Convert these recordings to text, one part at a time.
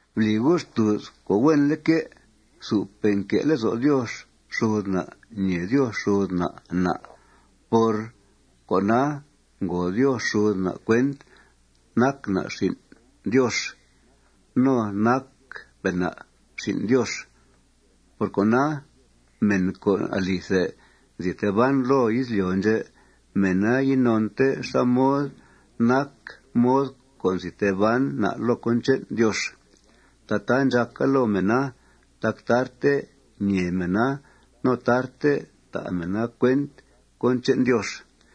Bli gu' xtùuz co' huenleque' supe' nque' lezo' Diox xud na' ñèe Diox xud na' na'. Por cona, ngo Diox xud na' cuent nac na' xin' Diox. No nacpe' na' xin' Diox. Por cona, mèn co' alithe nzi tee ban loo izlyo' ndxè', mèna inonte xá mod nac mod co' nzi tee ban na' loo cón che'n Diox. Tataa ndxàca loo mèna tac tarte nee mèna no tarte ta' mèna cuent cón che'n Diox.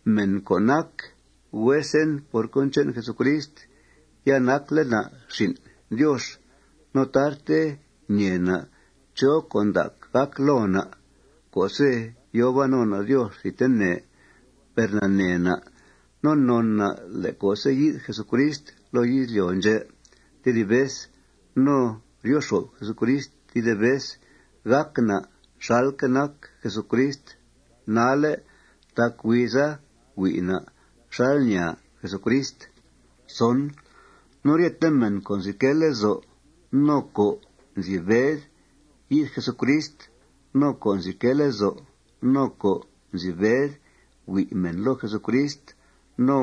Mèn co' nac huesen por cón che'n Jesucrist, ya nacle' na' xin' Diox. No tarte ñee na' chó con' ndac gàc loo na' co'se' yòo ban no na' Diox thidtene. Per nanee na' no non na' le' co'se' yi'th Jesucrist loo izlyo' ndxè' tedib vez no ryo xo'f Jesucrist tedib vez, gàc na' xalque' nac Jesucrist nalle' tac huiza hui' na' xal ñàa Jesucrist. No ryete mèn co' nzi quee lezo' no co' nzi bed yi'th Jesucrist no co' nzi quee lezo' no co' nzi bed hui' mèn loo Jesucrist no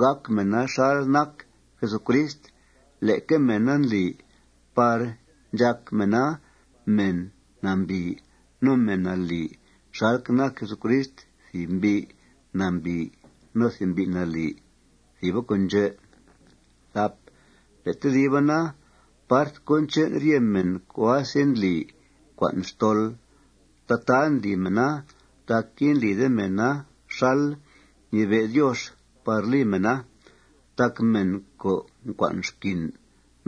gàc mèna xal nac Jesucrist, leque mèna ndli par ndxàc mèna mèn nambìi no mèn nalì xalque' nac Jesucrist thìb mbi' nambìi no thìb mbi' nalì. Thìba con' ndxè'. Le' tediba na, part cón che'n rye mèn co' asendli ncua'n xtol, tataa ndli mèna tac indlide mèna xal ñibe' Diox par li mèna. Tac mèn co' ncua'n xquin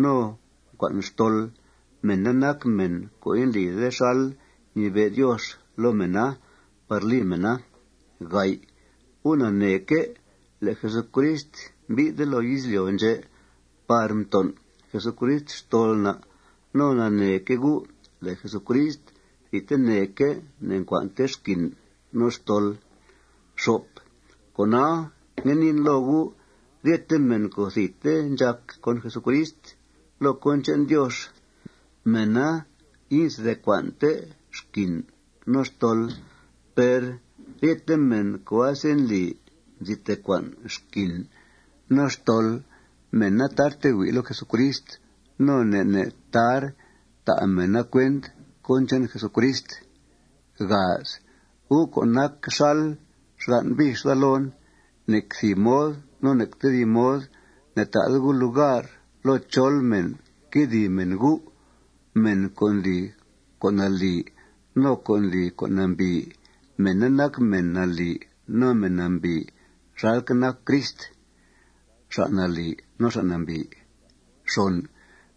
no co' ncua'n xtol, mèna nac mèn co' indlide xal ñibe' Diox loo mèna par li mèna. Gu' naneeque' le' Jesucrist mbi'thle' loo izlyo' ndxè' par mton' Jesucrist xtol na'. No naneeque' gu' le' Jesucrist thidteneque' ne'ncua'nte xquin no xtol. Cona, ngue niin loo gu': Rye mèn co' thidte ndxàc con Jesucrist loo cón che'n Diox, mèna inzi tee cua'nte xquin no xtol. Per ryete mèn co' asendli nzi tee cua'n xquin no xtol, mèna tar hui' loo Jesucrist. No ne' ne' tar ta' mèna cuent cón che'n Jesucrist. Gu' co' nac xal xgan' bix daa loon, nec thìb mod no nec tedib mod ne'ta'de gu' lugar loo chol mèn quedìi mèna gu'. Mèn co' ndli con' nalì no co' ndli con' nambìi, mèna nac mèn nalì no mèn nambìi xalque' nac Crist xa' nalì no xa' nambìi.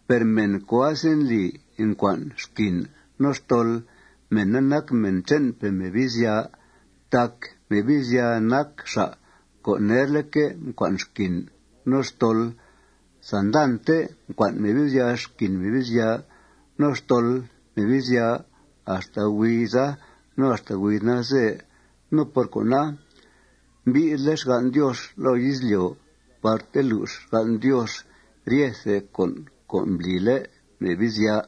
Per mèn co' asendli ncua'n xquin no xtol, mèna nac mèn che'npe' Mebizya tac Mebizya nac xa' co' nerleque' mcua'n xquin no xtol. Sandante mcua'n Mebizya xquin Mebizya no xtol Mebizya axta huiza no axta huiz nalze. No por cona, mbi'thle' xgan' Diox loo izlyo' par telux xgan' Diox ryethe con' co' mblile' Mebizya.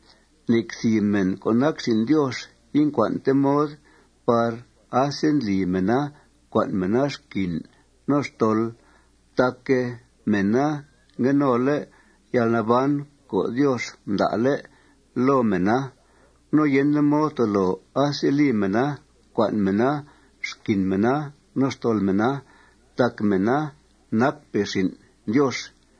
Nec thìb mèn co' nac xin' Diox incua'nte mod par asendli mèna ncua'n mèna xquin no xtol tac mèna ngue nole' yalnaban co' Diox mda'le' loo mèna. No yende mod tolo aseli mèna cua'n mèna xquin mèna no xtol mèna tac mèna nacpe' xin' Diox.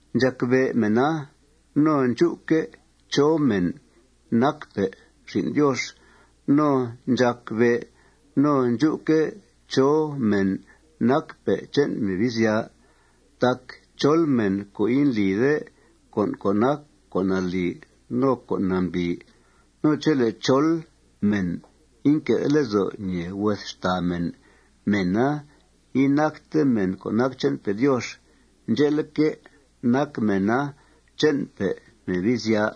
Ndxàc be' mèna no ndxú'que' chó mèn nacpe' xin' Diox no ndxàc bé' no ndxú'que' chó mèn nacpe' che'n Mebizya. Tac chol mèn co' indlide con' co' nac con' nalì no con' nambìi no chele' chol mèn inque'de lezo' ñèe hues xtàa mèn, mèna inacte mèn co' nac che'npe' Diox. Ndxe'leque', nac mèna che'npe' Mebizya.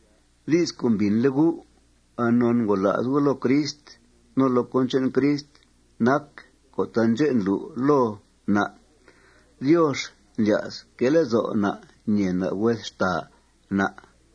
Di's co' mbìnle' gu' anon ngola's gu' loo Crist no loo cón che'n Crist nac co' taandxè' ndlu' loo na': Diox ndlya's que' lezo' na' ñèe na' hues xtàa na'.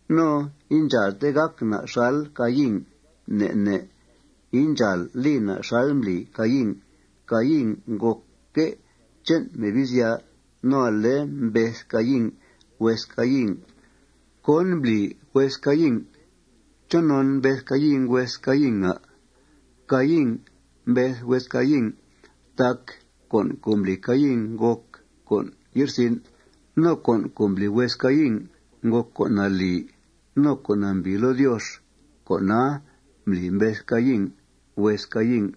No indxàalte gàc na' xal Caín. Ne' ne' indxàal li na' xal mbli Caín. Caín ngòcque' che'n Mebizya no ale mbeth Caín hues Caín. ¿Cón mbli hues Caín? ¿Chonon mbeth Caín hues Caín, à'? Caín mbeth hues Caín tac con' co' mbli Caín ngòc con' ye'rsin' no con' co' mbli hues Caín ngòc con' nalì no con' nambìi loo Diox. Con'a mbli mbeth Caín hues Caín.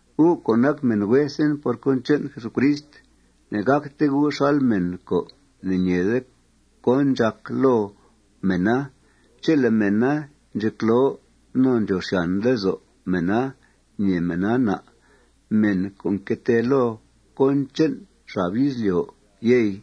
Gu' co' nac mèn huesen por cón che'n Jesucrist, ne'gàcte gu' xal mèn co' ne'ñeede cón ndxàc loo mèna chele' mèna ndxecloo no ndxòo xyàn lezo' mèna ñèe mèna na', mèn co' nque tee loo cón che'n xab izlyo', yey.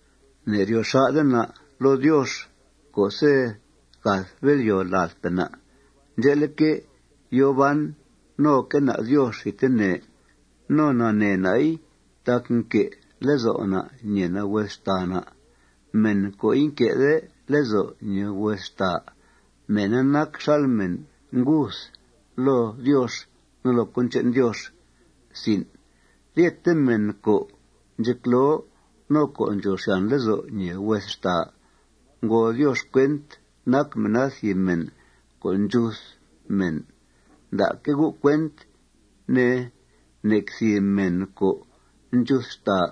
Ne'ryo xà'de na' loo Diox co'se' gath bél'yòo ladpe' na'. Ndxe'leque', yòo ban noque' na' Diox thidtene. No nanee na'i tac nque' lezo' na' ñèe na' hues xtàa na'. Mèn co' inque'de lezo' ñèe hues xtàa, mèna nac xal mèn nguth loo Diox no loo cón che'n Diox. Ryete mèn co' ndxecloo no co' ndxòo xyàn lezo' ñèe hues xtàa, ngòo Diox cuent nac mèna thìb mèn co' ndxuth mèn. Nda'que' gu' cuent, ne, nec thìb mèn co' ndxuth xtàa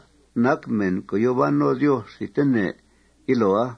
nac mèn co' yòo ban no Diox thidtene yiloa.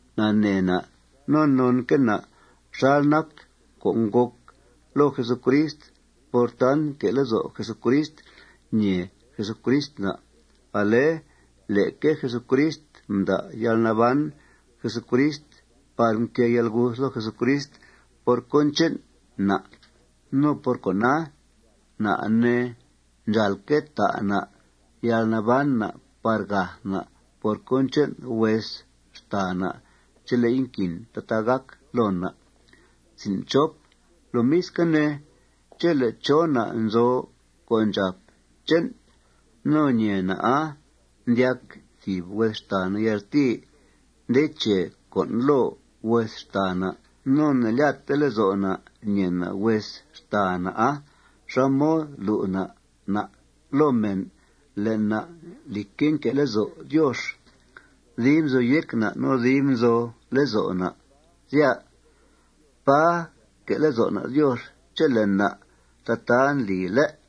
Nanee na' no nonque' na' xal nac co' ngòc loo Jesucrist por tant nque' lezo' Jesucrist ñèe Jesucrist na'. Ale leque Jesucrist mda' yalnaban Jesucrist par mquée yalguth loo Jesucrist por cón che'n na'. No por cona, na', ne, ndxàalque' ta' na' yalnaban na' par gath na' por cón che'n hues xtàa na' chele'i nquin tataa gàca loo na'. Lomisque' ne, chele' chó na' nzo co' ndxàp che'n no ñèe na'a ndyac tedib hues xtàa na' yaltìi nde che con' loo hues xtàa na', no ne'lyatte lezo' na' ñèe na' hues xtàa na'a, ¿xá mod lu' na' na' loo mèn le' na', lìcque', nque' lezo' Diox dib nzo yéc na' no dib nzo lezo' na', sya? Pà nque' lezo' na' Diox chele' na' tataa ndli, ¿lé'?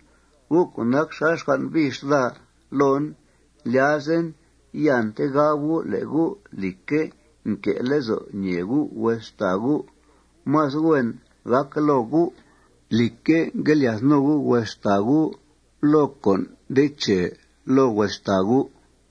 Gu' co' nac xal xgan' bix daa loon, ndlyazen iante gab gu' le' gu', lìcque', nque' lezo' ñèe gu' hues xtàa gu'. Más hues gàca loo gu', lìcque', ngue lyath no gu' hues xtàa gu' loo con' nde che loo hues xtàa gu'.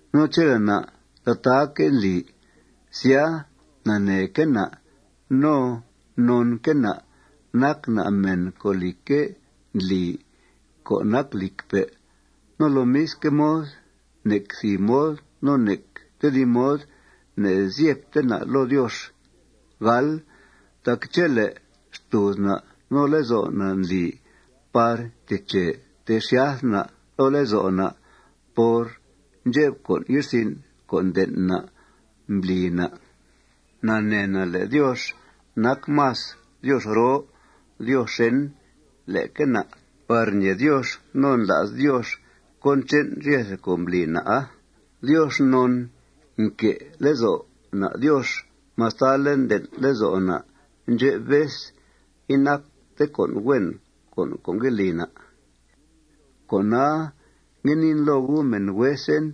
No chele' na' tataaque' ndli, sya, naneeque' na' no nonque' na' nac na' mèn co', lìcque', ndli co' nac lìcpe'. No lomisque' mod, nec thìb mod no nec tedib mod ne'zyebte na' loo Diox. Tac chele' xtùuz na' no lezo' na' ndli par nteche ntexyath na' loo lezo' na' por ndxep con' ye'rsin' co' nden' na' mbli na', nanee na' le' Diox nac más Diox roo Diox xèn leque na' par ñee Diox no ndla's Diox cón che'n ryethe con' mbli na'a. Diox non nque' lezo' na' Diox mastale' nden' lezo' na' ndxep vez inacte con' huen con' co' ngue li na'. Cona, ngue niin loo gu', mèn huesen: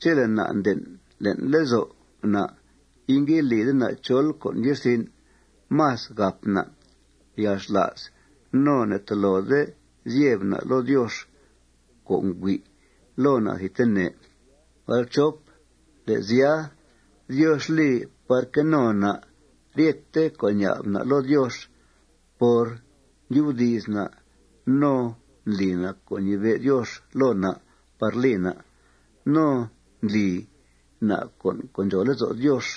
Chele' na' nden' le'n lezo' na' ingue lide na' chol con' ye'rsin', más gàp na' yalxla's no ne'tolode zyeb na' loo Diox co' ngüi' loo na' thidtene. Le' sya, Diox li par que no na' ryete con' ña'b na' loo Diox por ndyubdi's na' no ndli na' co' ñibe' Diox loo na' par li na'. No ndli na' con' co' ndxòo lezo' Diox.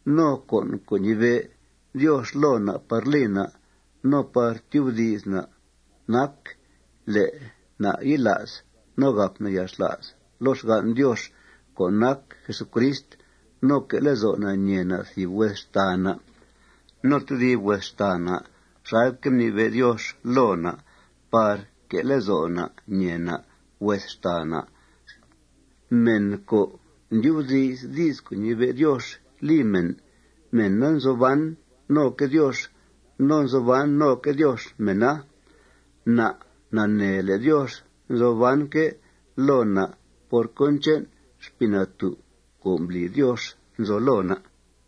No con' co' ñibe' Diox loo na' par li na' no par tyubdi's na' nac le' na' yila's no gàp na' yalxla's loo xgan' Diox co' nac Jesucrist no que' lezo' na' ñèe na' thìb hues xtàa no tedib hues xtàa na' xalque' mnibe' Diox loo na' par que' lezo' na' ñèe na' hues xtàa na'. Mèn co' ndyubdi's di's co' ñibe' Diox li mèn, mèna nzo ban noque' Diox no nzo ban noque' Diox mèna. Na' nanee le' Diox nzo banque' loo na' por cón che'n Xpii Natú' co' mbli Diox nzo loo na'.